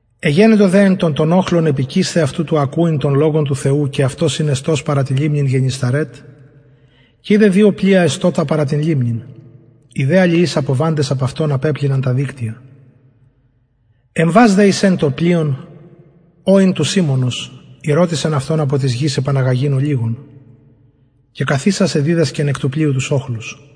εγενετο δε εν τω τον οχλον επικεισθαι αυτω του ακουειν τον λογον του θεου και αυτος ην εστως παρα την λιμνην γεννησαρετ και ειδεν δυο πλοια εστωτα παρα την λιμνην οι δε αλιεις αποβαντες απ αυτων απεπλυναν τα δικτυα εμβας δε εις εν των πλοιων ο ην του σιμωνος ηρωτησεν αυτον απο της γης επαναγαγειν ολιγον και καθισας εδιδασκεν εκ του πλοιου τους οχλους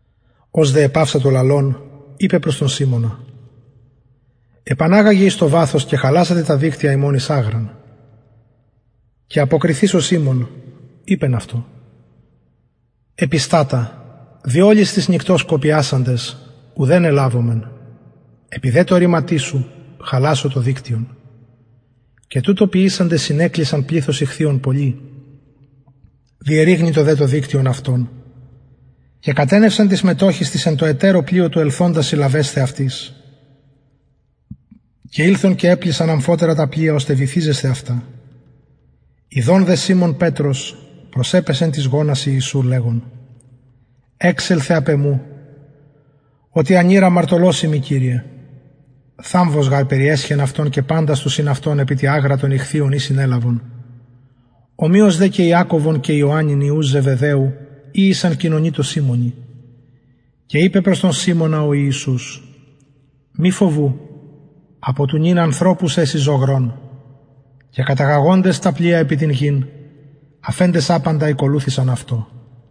ως δε επαυσατο λαλων ειπεν προς τον σιμωνα επαναγαγε εις το βαθος και χαλασατε τα δικτυα υμων εις αγραν και αποκριθεις ο σιμων ειπεν αυτω επιστατα δι ολης της νυκτος κοπιασαντες ουδεν ελαβομεν επι δε τω ρηματι σου χαλασω το δικτυον και τουτο ποιησαντες συνεκλεισαν πληθος ιχθυων πολυ διερρηγνυτο δε το δικτυον αυτων και κατενευσαν τοις μετοχοις τοις εν τω ετερω πλοιω του ελθοντας συλλαβεσθαι αυτοις και ηλθον και επλησαν αμφοτερα τα πλοια ωστε βυθιζεσθαι αυτα ιδων δε σιμων πετρος προσεπεσεν τοις γονασιν ιησου λεγων εξελθε απ εμου οτι ανηρ αμαρτωλος ειμι κυριε θαμβος γαρ περιεσχεν αυτον και παντας τους συν αυτω επι τη αγρα των ιχθυων η συνελαβον ομοιως δε και ιακωβον και ιωαννην υιους ζεβεδαιου οι ησαν κοινωνοι τω σιμωνι και ειπεν προς τον σιμωνα ο ιησους μη φοβου απο του νυν ανθρωπους εση ζωγρων και καταγαγοντες τα πλοια επι την γην αφεντες απαντα ηκολουθησαν αυτω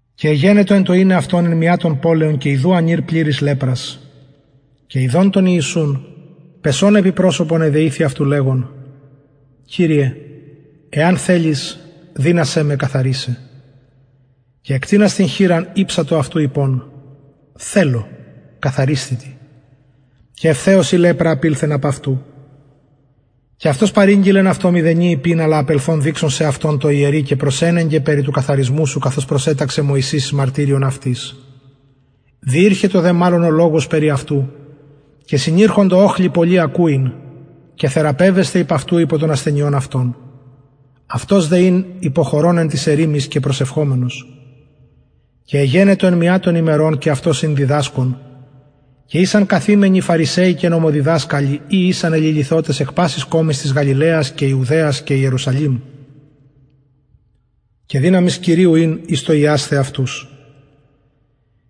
και εγενετο εν τω ειναι αυτον εν μια των πολεων και ιδου ανηρ πληρης λεπρας και ιδων τον ιησουν πεσων επι προσωπον εδεηθη αυτου λεγων κυριε εαν θελης δυνασαι με καθαρισαι και εκτεινας την χειρα ηψατο αυτου ειπων θελω καθαρισθητι και ευθεως η λεπρα απηλθεν απ αυτου και αυτος παρηγγειλεν αυτω μηδενι ειπειν αλλα απελθων δειξον σεαυτον τω ιερει και προσενεγκε περι του καθαρισμου σου καθως προσεταξεν μωσης εις μαρτυριον αυτοις διηρχετο δε μαλλον ο λογος περι αυτου και συνηρχοντο οχλοι πολλοι ακουειν και θεραπευεσθαι υπ αυτου απο των ασθενειων αυτων αυτος δε ην υποχωρων εν ταις ερημοις και προσευχομενος και εγενετο εν μια των ημερων και αυτος ην διδασκων και ησαν καθημενοι φαρισαιοι και νομοδιδασκαλοι οι ησαν εληλυθοτες εκ πασης κωμης της γαλιλαιας και ιουδαιας και ιερουσαλημ και δυναμις κυριου ην εις το ιασθαι αυτους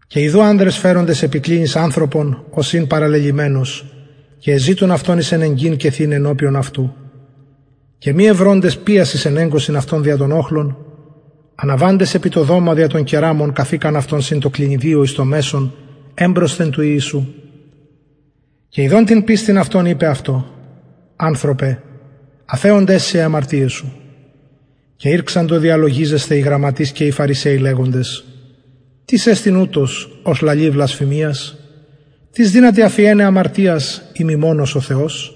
και ιδου ανδρες φεροντες επι κλινης ανθρωπον ος ην παραλελυμενος και εζητουν αυτον εισενεγκειν και θειναι ενωπιον αυτου και μη ευροντες ποιας εισενεγκωσιν αυτον δια τον οχλον αναβαντες επι το δωμα δια των κεραμων καθηκαν αυτον συν τω κλινιδιω εις το μεσον εμπροσθεν του ιησου και ιδων την πιστιν αυτων ειπεν αυτω ανθρωπε αφεωνται σοι αι αμαρτιαι σου και ηρξαντο διαλογιζεσθαι οι γραμματεις και οι φαρισαιοι λεγοντες τις εστιν ουτος ος λαλει βλασφημιας τις δυναται αφιεναι αμαρτιας ει μη μονος ο θεος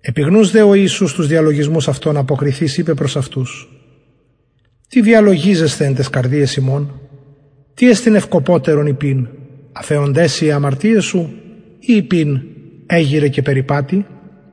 επιγνους δε ο ιησους τους διαλογισμους αυτων αποκριθεις ειπεν προς αυτους τι διαλογιζεσθε εν ταις καρδιαις υμων τι εστιν ευκοπωτερον ειπειν αφεωνται σοι αι αμαρτιαι σου η ειπειν εγειραι και περιπατει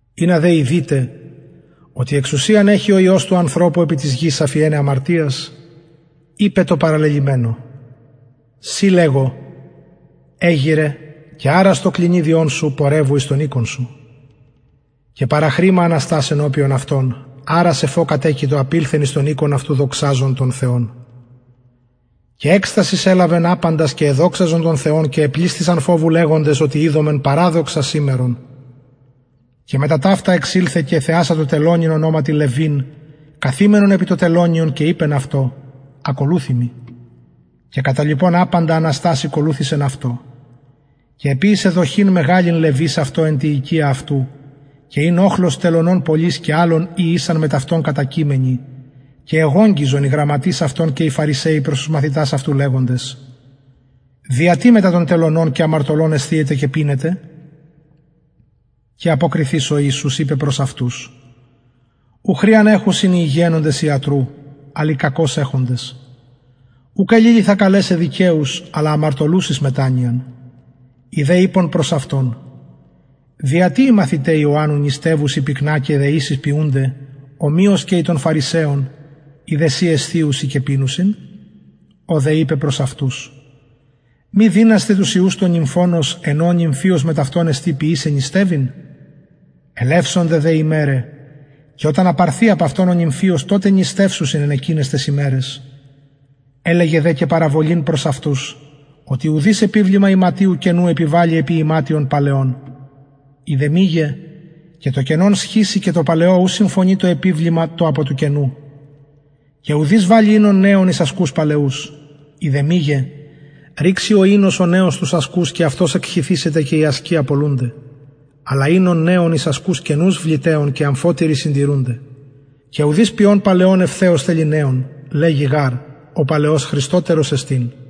ινα δε ειδητε οτι εξουσιαν εχει ο υιος του ανθρωπου επι της γης αφιεναι αμαρτιας ειπεν τω παραλελυμενω σοι λεγω εγειραι και αρας το κλινιδιον σου πορευου εις τον οικον σου και παραχρημα αναστας ενωπιον αυτων αρας εφ ο κατεκειτο απηλθεν εις τον οικον αυτου δοξαζων τον θεον και εκστασις ελαβεν απαντας και εδοξαζον τον θεον και επλησθησαν φοβου λεγοντες οτι ειδομεν παραδοξα σημερον και μετα ταυτα εξηλθεν και εθεασατο τελωνην ονοματι λευιν καθημενον επι το τελωνιον και ειπεν αυτω ακολουθει μοι και καταλιπων απαντα αναστας ηκολουθησεν αυτω και εποιησεν δοχην μεγαλην λευις αυτω εν τη οικια αυτου και ην οχλος τελωνων πολυς και αλλων οι ησαν μετ αυτων κατακειμενοι και εγογγυζον οι γραμματεις αυτων και οι φαρισαιοι προς τους μαθητας αυτου λεγοντες δια τι μετα των τελωνων και αμαρτωλων εσθιετε και πινετε και αποκριθεις ο ιησους ειπεν προς αυτους ου χρειαν εχουσιν οι υγιαινοντες ιατρου αλλ οι κακως εχοντες ουκ εληλυθα καλεσαι δικαιους αλλα αμαρτωλους εις μετανοιαν οι δε ειπον προς αυτον δια τι οι μαθηται ιωαννου νηστευουσιν πυκνα και δεησεις ποιουνται ομοιως και οι των φαρισαιων οι δε σοι εσθιουσιν και πινουσιν ο δε ειπεν προς αυτους μη δυνασθε τους υιους του νυμφωνος εν ω ο νυμφιος μετ αυτων εστιν ποιησαι νηστευειν ελευσονται δε ημεραι και οταν απαρθη απ αυτων ο νυμφιος τοτε νηστευσουσιν εν εκειναις ταις ημεραις ελεγεν δε και παραβολην προς αυτους οτι ουδεις επιβλημα ιματιου καινου επιβαλλει επι ιματιον παλαιον ει δε μηγε και το καινον σχιζει και τω παλαιω ου συμφωνει το απο του καινου και ουδεις βαλλει οινον νεον εις ασκους παλαιους ει δε μηγε ρηξει ο νεος οινος τους ασκους και αυτος εκχυθησεται και οι ασκοι απολουνται αλλα οινον νεον εις ασκους καινους βλητεον και αμφοτεροι συντηρουνται και ουδεις πιων παλαιον ευθεως θελει νεον λεγει γαρ ο παλαιος χρηστοτερος εστιν